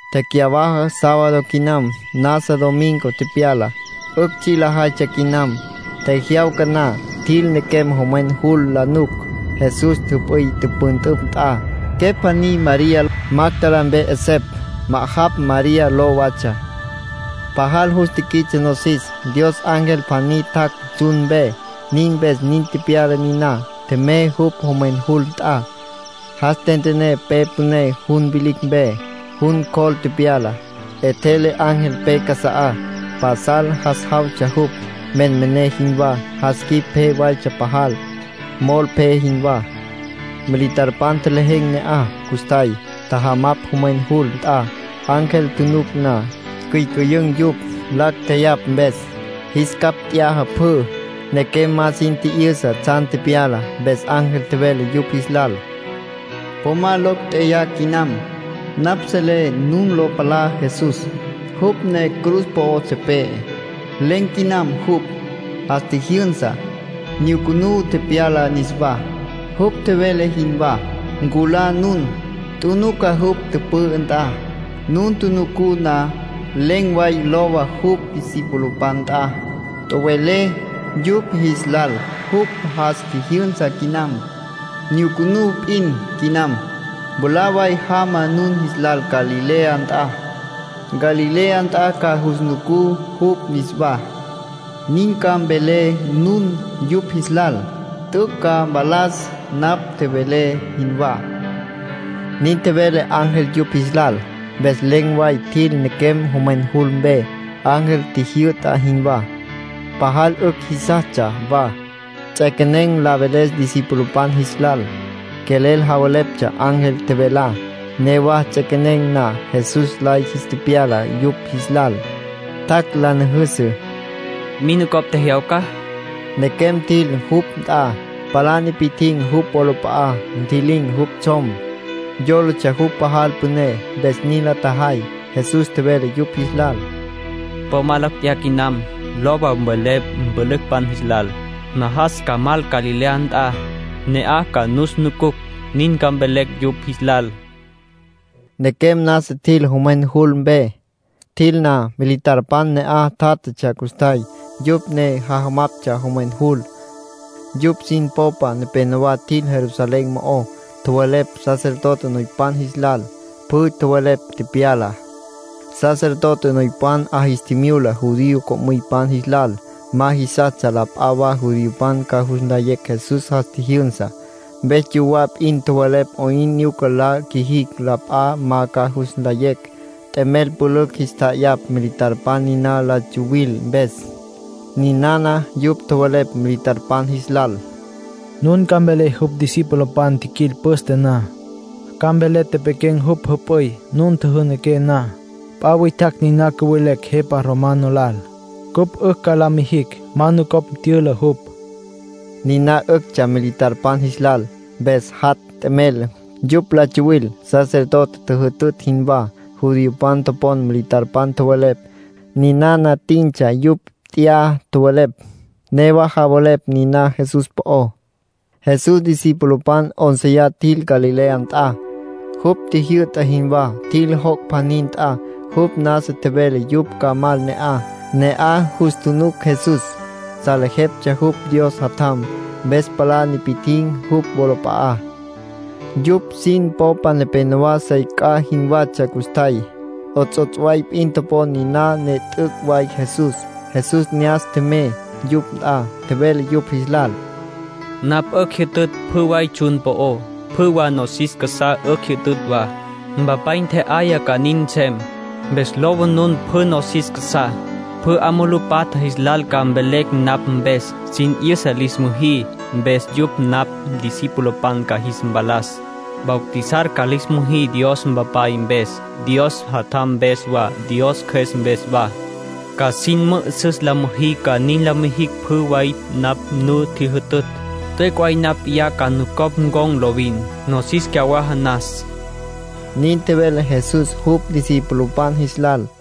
Tecyawaja sábado quinam, nasa domingo tepyala. 'Ücj tsji' lajaytsja quinam. Tjejyawca na, tjil nequem jomwen jul la nuc, Jesús jüp'üy tüpüntüpj nt'a. Quepj pjaní María, Magdalá mpe 'esepj. Ma'ajapj María ló watsja. Pajal jus tiquits'e nosis. Dios ángel pjaní tjac' tsjun mpe, nin mpes nin tepyala niná. Tjemey jupj jomwen jul nt'a. Jas tentené pe püné jun vilicj mpe. Jun cjol tepyala. 'Etjele ángel pe casa'á. Pasal jas jawtsja jupj, menmené jinwá. Jas quip pje waytsja pajal, mol pje jinwá. Militarpan tjelejen̈ ne'aj custjay. Tjajamapj jomwen jul nt'a. Ángel tjunuc na, ticyücüyün̈ yupj, lacj tjeyapj mpes. Jis capj t'yaja pjü. Nequem ma sin tji'yüsa tsjan tepyalá. Mpes ángel tjevele yupj jis lal: —Po ma locj tjeyá quinam. Napj selé nun lo palá Jesús. Jupj ne cruz po'o tepe'e. Len̈ quinam jupj. Jas tjijyünsa. Nyucunú tepyala niswá, jupj tjevele jinwá. Nculá nun. Tjunuca jupj tüpü'ü nt'a. Nun tjunucú na, len̈ way lowa jupj discipulopan nt'a. Tjowelé yupj jis lal jupj jas tjijyünsa quinam. Nyucunú p'in quinam. Mwalá way jama nun jis lal Galilea nt'a. Galilea nt'a ca jus nucú jupj niswá. Nin ca mvelé nun yupj jis lal. T'üc' ca mpalas napj tjevelé jinwá —nin tjevele ángel yupj jis lal. Mpes len̈ way tjil nequem jomwen jul mpe, ángel tjijyü'ta jinwá. Newa lacj jeyaptsja. Pajal 'ücj jisastsja wa. Ts'equenen̈ la veles discipulopan jis lal. Quelel javeleptsja ángel tjevelá. Newa ts'equenen̈ na, Jesús lay jis tepyala yupj jis lal. Tjac' la nüjüsü. —¿Min nucopj tjejyawca? —tjevele jupj. Nequem tjil jupj nt'a, palá nipi'tjin̈ jupj wolap'a'á. Ntji'lin̈ jupj tsjom. Yólatsja jupj pajal püné, mpes nin la tjajay. Jesús tjevele yupj jis lal: —Po ma locj tjeyá quinam. Lowa, mvelé mpülücpan jis lal. Najas ca mal Galilea nt'a. Ne'aj ca nus nucucj. Nin ca mvelé yupj jis lal —tjevele. Nequem nasa tjil jomwen jul mpe. Tjil na, militarpan ne'aj tjátjatsja custjay, yupj ne jajamaptsja jomwen jul. Yupj sin popa nepenowá tjil Jerusalén mo'ó. Tjowelepj sacerdote noypan jis lal. Pjü tjowelepj tepyalá. Sacerdote noypan 'a jis tjimyula judío co'müypan jis lal. Ma jisastsja la p'a wa judiopan ca jus nlayecj Jesús jas tjijyünsa. Mpes yuwá p'in tjowelepj 'oyn nyuca la qjuijicj la p'a ma ca jus nlayecj. T'emel pülücj jis tja'ayapj militarpan niná la tsuwil mpes. Ninana yupj tjowelepj militarpan jis lal: “Nun ca mvelé jupj discipulopan tjiquil püste na. Ca mvelé tepequen̈ jupj jüp'üy nun tjüjünaqué na. P'a witjacj niná cüvelecj jepa romano lal, cupj 'ücj ca la mijicj ma nucopj tyüla jupj”, nin tjowelepj yupj. Niná 'üctsja militarpan jis lal. Mpes natj t'emel. Yupj la tsawil, sacerdotepan tjüjütütj jinwá. Judiopan topon militarpan tjowelepj. Ninana tintsja yupj t'ya tjowelepj, newa javelepj niná Jesús po'ó. Jesús discipulopan 'ónceya tjil Galilea nt'a, jupj tjijyü'ta jinwá. Tjil joc' pjaní nt'a, jupj nasa tjevele yupj ca mal ne'aj. Ne'aj jus tjunuc Jesús. Salejeptsja jupj Dios Jatjam, mpes palá nipi'tjin̈ jupj wolap'a'á. Yupj sin popa nepenowá sey c'a jinwatsja custjay. 'Ots'ots' way p'in topon niná ne t'üc' way Jesús. Jesús ne'as tjemey yupj nt'a. Tjevele yupj jis lal: —Napj 'ücj jyütütj pjü way tsjun po'ó. Pjü wa nosis casá 'ücj jyütütj wa. Mpapay ntje'aya ca nin nsem. Mpes lowa nun pjü nosis casá. Pjü 'a mulú patja jis lal ca mvelé napj mpes. Sin 'yüsa lis müjí, mpes yupj napj discipulopan ca jis mpalas. Bautizar ca lis müjí Dios Mpapay mpes, Dios Jatjam mpes wa, Dios Cjües mpes wa. Ca sin mü'üsüs la müjí ca nin la mijicj pjü way napj nu tjijyütütj. T'üc' way napj p'iyá ca nucopj ncon̈ lovin, nosis cyawaja nas —nin tjevele Jesús jupj discipulopan jis lal.